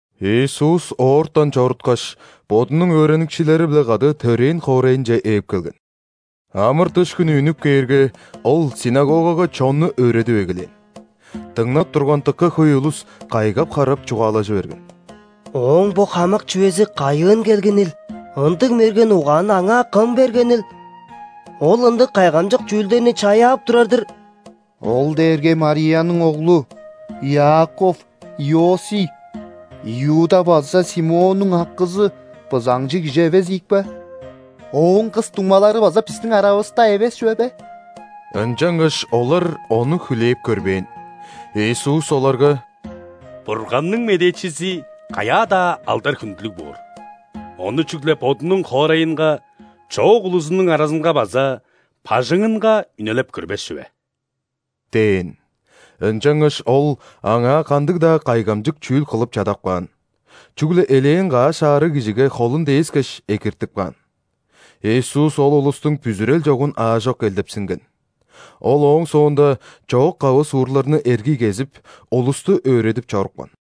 Иисус оортан чоруткаш, Бодунуң өөреникчилери-биле кады төрээн хоорайынче ээп келген. Амыр-дыш хүнү үнүп кээрге, Ол ·синагогага чонну өөредип эгелээн. Дыңнап турган дыка хөй улус кайгап-харап, чугаалажы берген: «Ооң бо хамык чүвези кайыын келгенил? Ындыг мерген угаанны Аңаа кым бергенил? Ол ындыг кайгамчык чүүлдерни чаяап турар-дыр! Ол дээрге Марияның оглу, Иаков, Иосий, Иуда база Симоннуң акызы, бызаңчы кижи эвес ийикпе? Ооң кыс дуңмалары база бистиң аравыста эвес чүве бе?» Ынчангаш олар Ону хүлээп көрбээн. Иисус оларга: «Бурганның медээчизи каяа-даа алдар-хүндүлүг боор, ону чүгле бодунуң хоорайынга, чоок улузунуң аразынга база бажыңынга үнелеп көрбес чүве» – дээн. Ынчангаш Ол аңаа кандыг-даа кайгамчык чүүл кылып чадап каан, чүгле элээн каш аарыг кижиге холун дээскеш, экиртип каан. Иисус ол улустуң бүзүрел чогун аажок элдепсинген. Ол ооң соонда чоок-кавы суурларны эргий кезип, улусту өөредип чорупкан.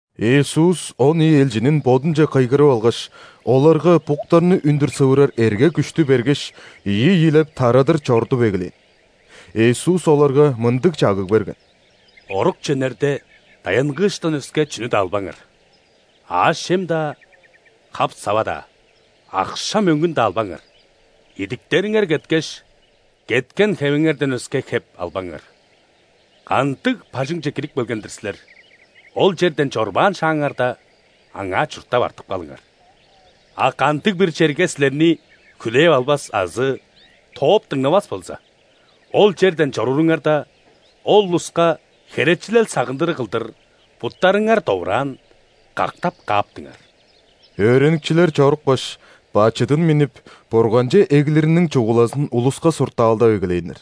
Иисус он ийи элчинин Бодунче кыйгырып алгаш, оларга буктарны үндүр сывырар эрге-күштү бергеш, ийи-ийилеп, тарадыр чорудуп эгелээн. Иисус оларга мындыг чагыг берген: «Орукче үнерде, даянгыыштан өске чүнү-даа албаңар: аъш-чем-даа, хап-сава-даа, акша-мөңгүн-даа албаңар. Идиктериңер кеткеш, кеткен хевиңерден өске хеп албаңар. Кандыг бажыңче кирип келген-дир силер, ол черден чорбаан шааңарда, аңаа чурттап артып калыңар. А кандыг-бир черге силерни хүлээп албас азы тооп дыңнавас болза, ол черден чорууруңарда, ол улуска херечилел-сагындырыг кылдыр буттарыңар довураан кактап кааптыңар». Өөреникчилер чорупкаш, бачыдын миннип, Бурганче эглириниң чугулазын улуска суртаалдап эгелээннер.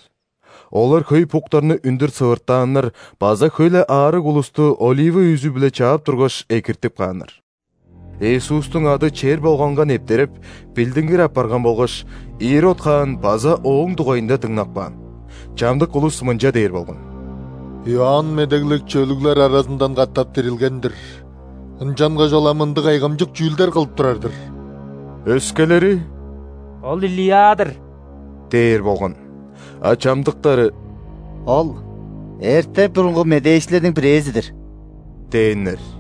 Олар хөй буктарны үндүр сывыртааннар база хөй-ле аарыг улусту олива үзү-биле чаап тургаш, экиртип кааннар. Иисустуң ады чер болганга нептереп, билдингир апарган болгаш, Ирод хаан база Ооң дугайында дыңнап каан. Чамдык улус мынча дээр болган: «Иоанн Медеглекчи өлүглер аразындан катап дирилген-дир, ынчангаш ол ам ындыг кайгамчык чүүлдер кылып турар-дыр». Өскелери: «Ол – Илия-дыр» – дээр болган. А чамдыктары: «Ол – эрте-бурунгу медээчилерниң бирээзи-дир» – дээннер.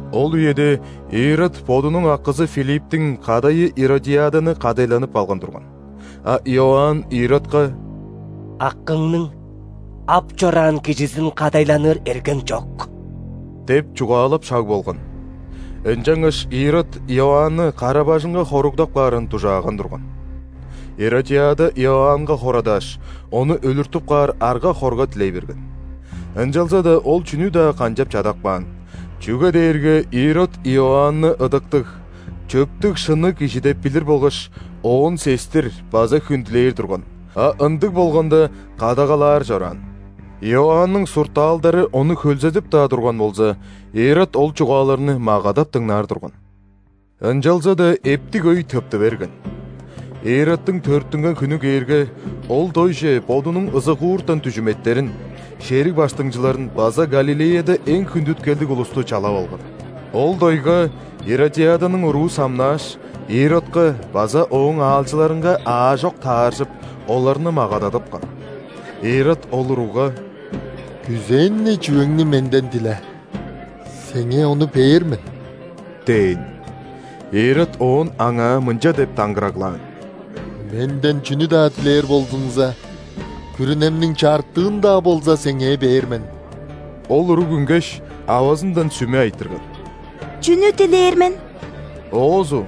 Ол үеде Ирод бодунуң акызы Филипптиң кадайы Иродиаданы кадайланып алган турган, а Иоанн Иродка: «Акыңның ап чораан кижизин кадайланыр эргең чок» – деп чугаалап шаг болган. Ынчангаш Ирод Иоанны кара-бажыңга хоругдап каарын дужааган турган. Иродиада Иоаннга хорадааш, ону өлүртүп каар арга-хорга дилей берген. Ынчалза-даа ол чүнү-даа канчап чадап каан, чүге дээрге Ирод Иоанны ыдыктыг, чөптүг-шынныг кижи деп билир болгаш, оон сестир база хүндүлээр турган, а ындыг болганда, кадагалаар чораан. Иоанның суртаалдары ону хөлзедип-даа турган болза, Ирод ол чугааларны магадап дыңнаар турган. Ынчалза-даа эптиг өй тыпты берген. Иродтуң төрүттүнген хүнү кээрге, ол дойже бодунуң ызыгууртан дүжүметтерин, шериг баштыңчыларын база Галилеяда эң хүндүткелдиг улусту чалап алган. Ол дойга Иродиаданың уруу самнааш, Иродка база ооң аалчыларынга аажок тааржып, оларны магададыпкан. Ирод ол уругга: «Күзээн-не чүвеңни менден диле, сеңээ ону бээр мен» – дээн. Ирод оон аңаа мынча деп даңгыраглаан: «Менден чүнү-даа дилээр болзуңза, күрүнемниң чартыын-даа болза, сеңээ бээр мен!» Ол уруг үнгеш, авазындан сүме айтырган: «Чүнү дилээр мен?» Оозу: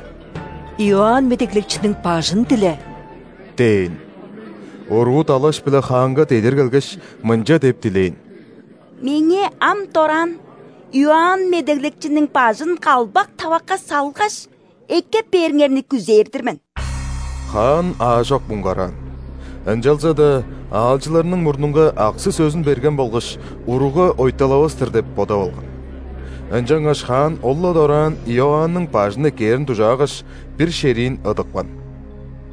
«Иоанн Медеглекчиниң бажын диле» – дээн. Уруу далаш-биле хаанга дедир келгеш, мынча деп дилээн: «Меңээ ам дораан Иоанн Медеглекчиниң бажын калбак тавакка салгаш, эккеп бээриңерни күзээр-дир мен». Хаан аажок муңгараан, ынчалза-даа аалчыларының мурнунга аксы-сөзүн берген болгаш, уругга ойталавас-тыр деп бодап алган. Ынчангаш хаан ол-ла дораан Иоанның бажын эккээрин дужаагаш, бир шериин ыдыпкан.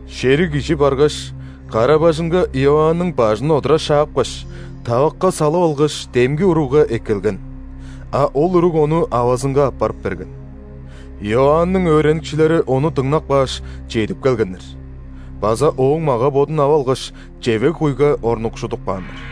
Шериг кижи баргаш, кара-бажыңга Иоанның бажын одура шапкаш, тавакка салып алгаш, демги уругга эккелген. А ол уруг ону авазынга аппарып берген. Иоанның өөреникчилери ону дыңнап кааш, чедип келгеннер база ооң мага-бодун ап алгаш, чевег-куйга орнукшудуп кааннар.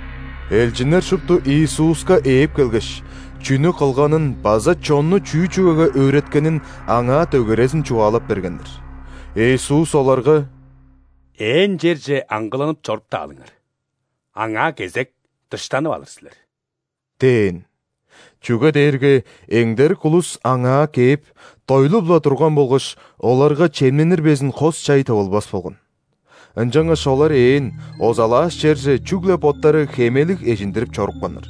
Элчиннер шупту Иисуска ээп келгеш, чүнү кылганын база чонну чүү чүвеге өөреткенин Аңаа дөгерезин чугаалап бергеннер. Иисус оларга: «Ээн черже аңгыланып чоруптаалыңар, аңаа кезек дыштанып алыр силер» – дээн. Чүге дээрге эңдерик улус Аңаа кээп, дойлуп-ла турган болгаш, оларга чемненир безин хос-чай тывылбас болган. Ынчангаш олар ээн, озалааш черже чүгле боттары хемелиг эжиндирип чорупканнар.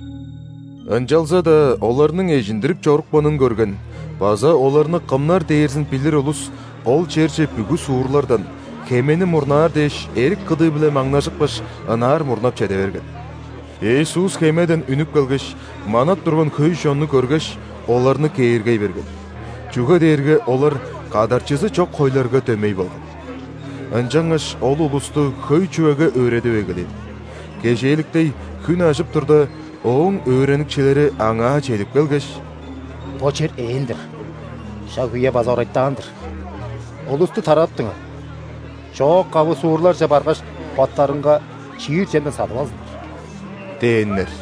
Ынчалза-даа оларның эжиндирип чорупканын көрген база оларны кымнар дээрзин билир улус ол черже бүгү суурлардан, хемени мурнаар дээш, эрик кыдыы-биле маңнажыпкаш, ынаар мурнап чеде берген. Иисус хемеден үнүп келгеш, манап турган хөй чонну көргеш, оларны кээргей берген, чүге дээрге олар кадарчызы чок хойларга дөмей болган. Ынчангаш Ол улусту хөй чүвеге өөредип эгелээн. Кежээликтей, хүн ажып турда, Ооң өөреникчилери Аңаа чедип келгеш: «Бо чер ээн-дир, шак-үе база орайтаан-дыр. Улусту тарадыптыңар, чоок-кавы суурларже баргаш, боттарынга чиир чемден садып алзыннар» – дээннер.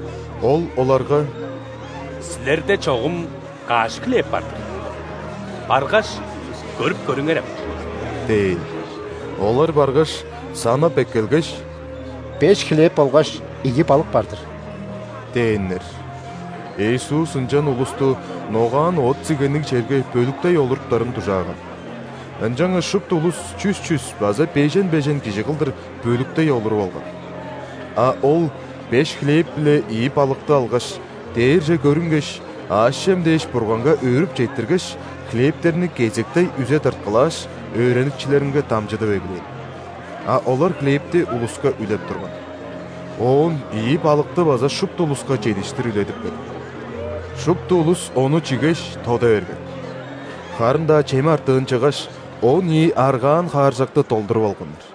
Ол оларга: «Силерде чогум каш хлеб бар-дыр? Баргаш, көрүп көрүңерем» – дээн. Олар баргаш, санап эккелгеш: «Беш хлеб болгаш ийи балык бар-дыр» – дээннер. Иисус ынчан улусту ногаан оът-сигенниг черге бөлүктей олуртуптарын дужааган. Ынчангаш шупту улус чүс-чүс база бежен-бежен кижи кылдыр бөлүктей олуруп алган. А Ол беш хлеб биле ийи балыкты алгаш, дээрже көрүнгеш, аъш-чем дээш Бурганга өөрүп четтиргеш, хлебтерни кезектей үзе тырткылааш, өөреникчилеринге дамчыдып эгелээн. А олар хлебти улуска үлеп турган. Оон ийи балыкты база шупту улуска чедиштир үледипкен. Шупту улус ону чигеш, тода берген. Харын-даа чем артыын чыггаш, он ийи аргаан хааржакты долдуруп алганнар.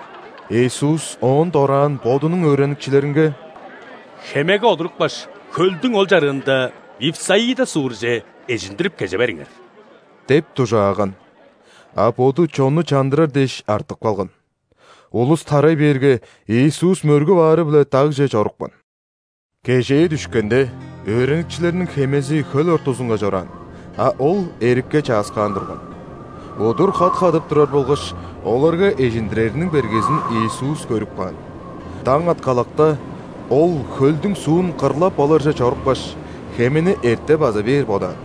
Иисус оон дораан Бодунуң өөреникчилеринге: «Хемеге олурупкаш, хөлдүң ол чарыында Вифсаида суурже эжиндирип кеже бериңер» – деп дужааган. А Боду чонну чандырар дээш, артып калган. Улус тарай бээрге, Иисус мөргүп аары-биле дагже чорупкан. Кежээ дүшкенде, өөреникчилерниң хемези хөл ортузунга чораан, а Ол эрикке чааскаан турган. Удур хат хадып турар болгаш, оларга эжиндирериниң бергезин Иисус көрүп каан. Даң аткалакта, Ол хөлдүң суун кырлап оларже чорупкаш, хемени эрте база бээр бодаан.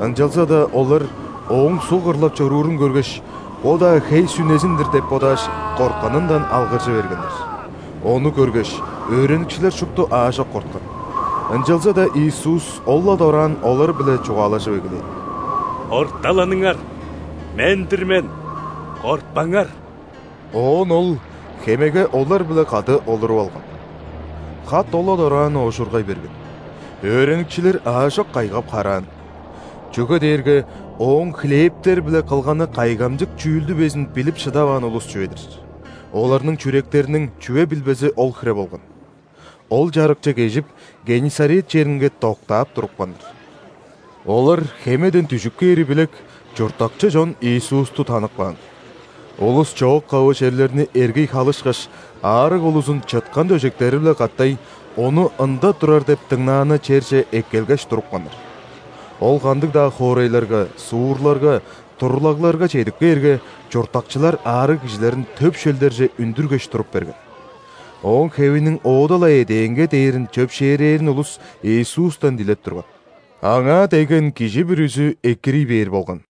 Ынчалза-даа олар Ооң суг кырлап чоруурун көргеш, бо-даа хей-сүнезин-дир деп бодааш, кортканындан алгыржы бергеннер. Ону көргеш, өөреникчилер шупту аажок корткан. Ынчалза-даа Иисус ол-ла дораан олар-биле чугаалажып эгелээн: «Орталаныңар, Мен-дир мен, кортпаңар!» Оон Ол хемеге олар-биле кады олуруп алган. Хат ол-ла дораан оожургай берген. Өөреникчилер аажок кайгап-хараан. Чүге дээрге Ооң хлебтер-биле кылганы кайгамчык чүүлдү безин билип шыдаваан улус чүве-дир. Оларның чүректериниң чүве билбези ол хире болган. Ол чарыкче кежип, Геннисарет черинге доктаап турупканнар. Олар хемеден дүжүп кээри билек, чурттакчы чон Иисусту танып каан. Улус чоок-кавы черлерни эргий халышкаш, аарыг улузун чыткан дөжектери-биле катай Ону ында турар деп дыңнааны черже эккелгеш турупканнар. Ол кандыг-даа хоорайларга, суурларга, турлагларга чедип кээрге, чурттакчылар аарыг кижилерин төп шөлдерже үндүргеш туруп берген. Ооң хевиниң оода-ла эдээнге дээрин чөпшээрээрин улус Иисустан дилеп турган. Аңаа дегген кижи бүрүзү экирий бээр болган.